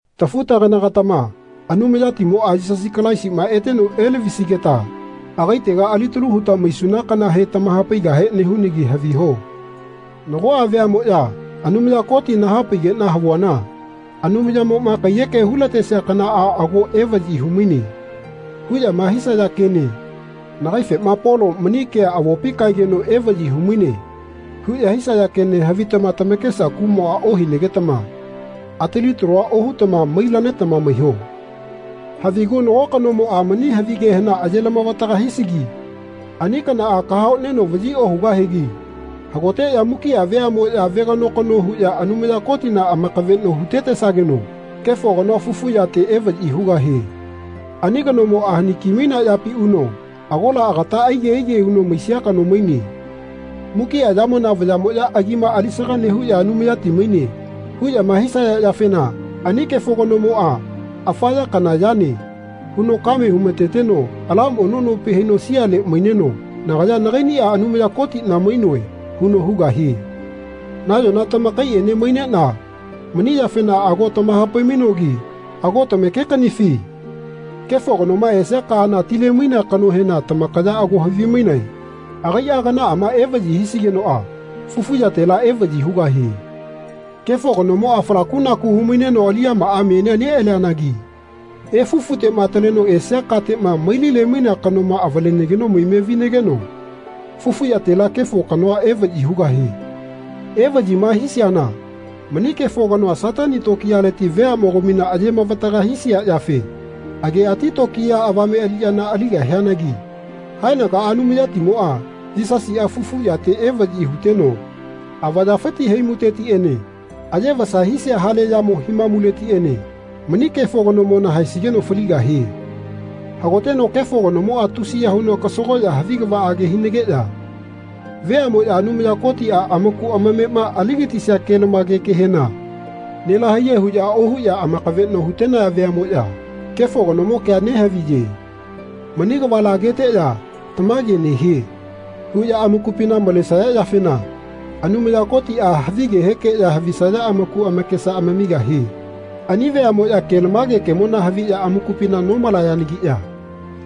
Tafu-tagana-gatama Anumayatimoa, Yisasi Kalaisima eteno elavisigeta agaitega alitalu huta maisuna kanahe tamahapaigahe nehunagi haviho. Nagoa veamoya Anumaya Koti nahapaigena havuana Anumayamoma kaiyeke hulatesia kanaa ago evayi humaine. huyama hisaya kene nagaifema Polo mani kea avopi kaegeno evayi humaine. huya hisaya kene havitama tamakesa kumoa ohinagetama atali talua ohutama mai-lanetama maiho. Havigu nago kanomoa mani havigehena aye-lamavataga hisigi ani kanaa kahaoneno vayi ohugahigi hagoteya mukia veamoya vegano-kano huya Anumaya Kotina amakaveno hutetesageno Kefo Kanoa fufu yate evayi hugahie. Ani kanomoa hani kimainea yapi uno agola agata aige aige huno maisia kano maine. Mukia yamona vayamoya agima alisaga nehuya Anumayati maine. huyama hisaya yafena ani Kefo Kanomoa Afa ya kana yane. huno kame humateteno ala mono nopi haino siale maineno Nagaya nagainia Anumaya Kotina mainoe. huno hugahie. Nayona tamakaiene mainena mani yafena ago tamahapai-mainogi ago tamake-kanifi? Kefo Kanoma esia kaana tile-mainea kanohena tamakaya ago havimainae. Agaia kanaama vayi hisigenoa fufu yatela evayi hugahie. Kefo Kanomoa falakunaku humaineno aliyamaa menia nealianagi efufutema ataleno esia katema mailile-mainea kanoma avalenageno maime vinageno fufu yatela Kefo Kano evayi hugahie. Evayima hisiana mani Kefo Kanoa Satani tokiyaleti veamogamina aye-mavataga hisia yafe ageati tokiya avame aliyana aligahianagi haenagaa Anumayatimoa Yisasia fufu yate evayi huteno avayafiti haimutetiene aye vasa hisia hale yamo himamuletiene mani Kefo Kanomona haesigeno faligahie. Hagoteno Kefo Kanomoa tusiya huno kasagoya havi kavaage hinageya veamoya Anumaya Kotia amaku amamema aligatisia ke-lamage kehena nelahaiye huya ohuya amakaveno hutenaya veamoya Kefo Kanomo kea nehaviye. Mani kavala ageteya Tamage nehie. huya amakupina malesaya yafena Anumaya Kotia havigehekeya havisaya amaku amakesa amamigahie. Ani veamoya kelamage kemona haviya amakupina nomalayanagiya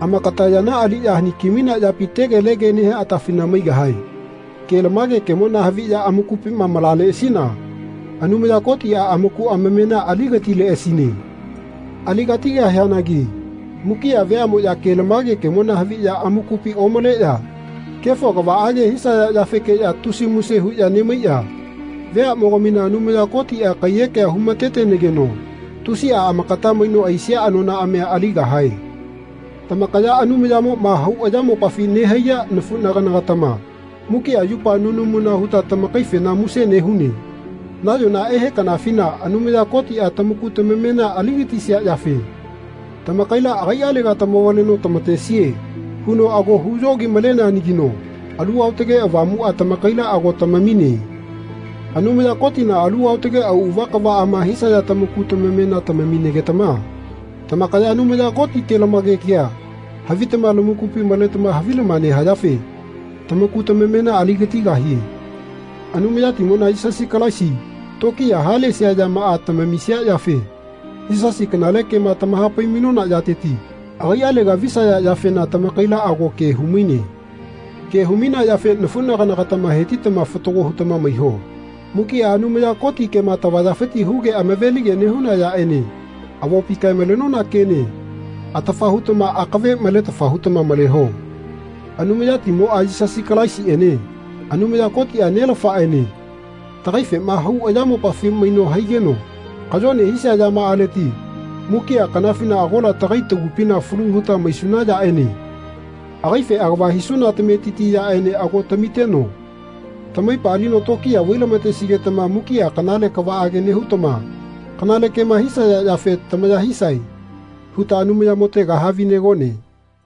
amakata yana aliya haniki-mainea yapi tegelege nehia atafina maigahae. Kelamage kemona haviya amakupima malaleasina Anumaya Kotia amaku amamena aligatileasine. Aligatigahianagi mukia vemoya kelamage kemona haviya amakupi omaleya kefo kavaage hisaya yafekeya tusia muse huya nemaiya veamogamina Anumaya Kotia kaiyekea humatetenageno tusia amakata maino aisia anonaamia aligahae. Tamakaya Anumayamoma hau ayamopafi nehaiya nafunagana-gatama mukia yupa nunamuna huta tamakaifena muse nehune. Nayona ehe kanafina Anumaya Kotia tamaku tamamena aligatisia yafe tamakaila agaialega tamavaleno tamatesie huno ago huyogi-maleneanagino Alu Aotage Avamua tamakaila ago tamamine. Anumaya Kotina alu aotage auava kavaama hisaya tamaku tamamena tamamigetama tamakaya Anumaya Koti kelamage kea havitama lamakupi maletama havilama nehayafe tamaku tamamena aligatigahie. Anumayatimona, Yisasi Kalaisi tokiya halesia yamaa tamamisia yafe Yisasife kanale kema tamahapai-mainona yateti agaialega visaya yafena tamakaila ago ke humaine. Ke humainea yafe nafunagana-gatama hetitama fatago hutama maiho. Mukia Anumaya Koti kema tavayafiti huge amave-lige nehuna yaene avopi kae-malenona kene atafa hutama akave maletafa hutama maleho. Anumayatimoa, Yisasi Kalaisiene Anumaya Kotia, Nelafaene tagaifema hau ayamopafi maino haigeno kayone hisia yamaaleti mukia kanafina agola tagai tagupina falu huta maisuna yaene agaife agava hisuna tametiti yaene ago tamiteno tamaipa alino tokiya vailamatesigetama mukia kanale kavaage nehutama kanale kema hisaya yafe tamaya hisae huta Anumayamotega havinegone.